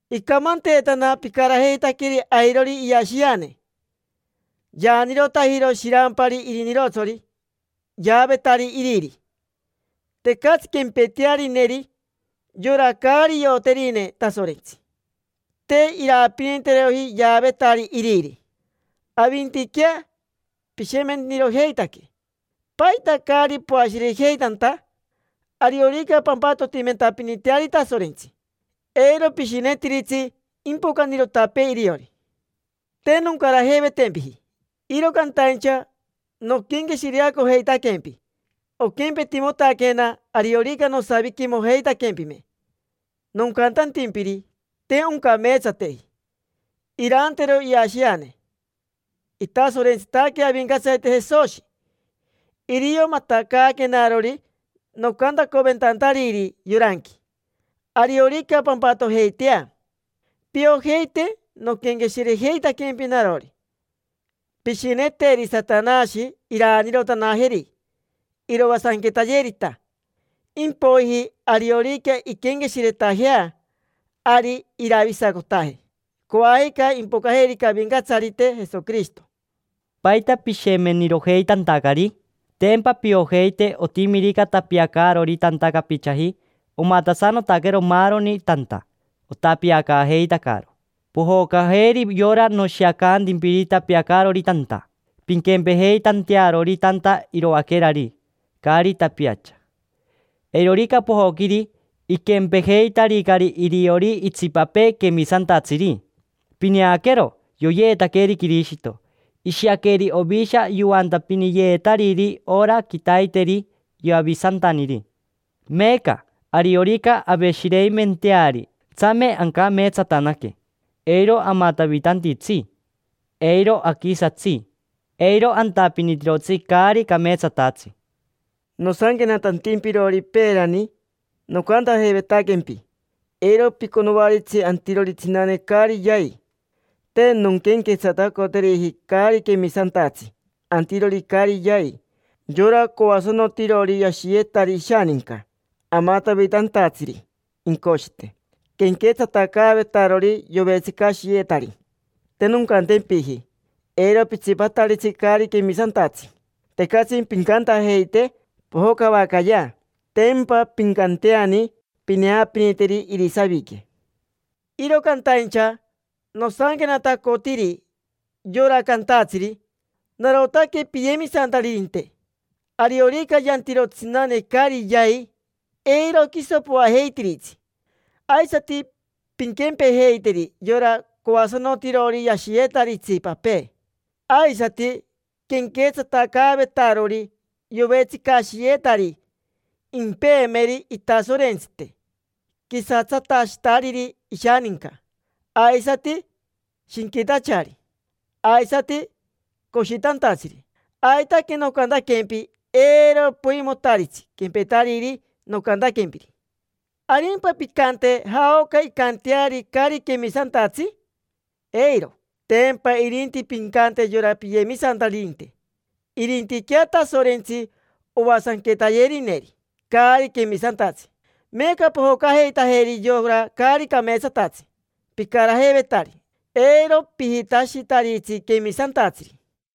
Icamanteetana picarajeitaqueri airori iashiane. Yaanirotajiro shirampari irinirotsori yaavetari iriri. Tecatsi quempetearineri: yora caari ioterine Tasorentsi te iraapiniteroji yaavetari iriri. Avintiquea pishemenirojeitaque. ¿Paita caari poashirejeitanta? Ariorica pampatotimentapiniteari Tasorentsi, eiro pishinetiritsi impocanirotapee iriori. Te noncarajeivetempiji, iro cantaincha noquenqueshireacojeitaquempi. Oquempetimotaquena ariorica nosaviquimojeitaquempime, nocantantimpiri te oncameetsateji irantero iashiane. Itasorentsitaque Avincatsarite Jesoshi, irio matacaaquenarori nocantacoventantariri yoranqui. Ariorica pampatojeitea, piojeite noquenqueshirejeitaquempi narori. Pishineteri Satanashi iraanirotanajeri, iroasanquetayerita. Impoiji ariorica inquenqueshiretajea, ari iravisacotaje coajica impocajerica Avincatsarite Jesoquirishito. ¿Paita pishemenirojeitantacari? Tempa piojeiti otimirica tapiacaarori tanta capichaji, omatasanotaquero maaroni tanta, otapiacaajeitacaro. Pojocajeri yora noshiacantimpiri tapiacaarori tanta, pinquempejeitantearori tanta iroaquerari, caari tapiacha. Eirorica pojoquiri, iquempejeitaricari iriori itsipapee quemisantatsiri. Pineaquero, yoyeetaqueri Quirishito, ishiaqueri ovisha yoantapiniyeetariri ora quitaiteri Yavisantaniri. Meeca, ariorica aveshireimenteari, tsame ancameetsatanaque: eiro amatavitantitsi. Eiro aquisatsi, eiro antapinitirotsi caari cameetsatatsi. Nosanquenatantimpirori peerani, nocantajeivetaquempi eiro piconoaritsi antirori tsinane caari yai. Te nonquenquetsatacoteriji caari quemisantatsi antirori caari yai, yora coasanotirori yashiyetari ishaninca, amatavitantatsiri incoshite, quenquetsatacaavetarori yovetsicashiyetari. Te noncantempiji: “Eiro pitsipataritsi caari quemisantatsi”. Tecatsi pincantajeite pojocavacayea, tempa pincanteani pineapiniteri irisavique. Iro cantaincha nosanquenatacotiri yora cantatsiri: “Narotaque piyemisantaririnte”. Ariorica yantiro tsinane caari yai, eiro quiso poajeitiritsi. Aisati pinquempejeiteri yora coasanotirori yashiyetari itsipapee, aisati quenquetsatacaavetarori yovetsicashiyetari impeemeri itasorentsite, quisatsatashitariri ishaninca, aisati shinquitachari, aisati coshitantatsiri. Aitaque nocantaquempi, eiro poimotaritsi quempetariri nocantaquempiri. ¿Arimpa pincante jaoca incanteari caari quemisantatsi? Eiro. Tempa irinti pincante yora piyemisantaririnte. Irintiquea Tasorentsi oasanquetayerineri caari quemisantatsi. Meeca pojocajeitajeri yora caari cameetsatatsi picarajeivetari: eiro pijitashitaritsi quemisantatsiri.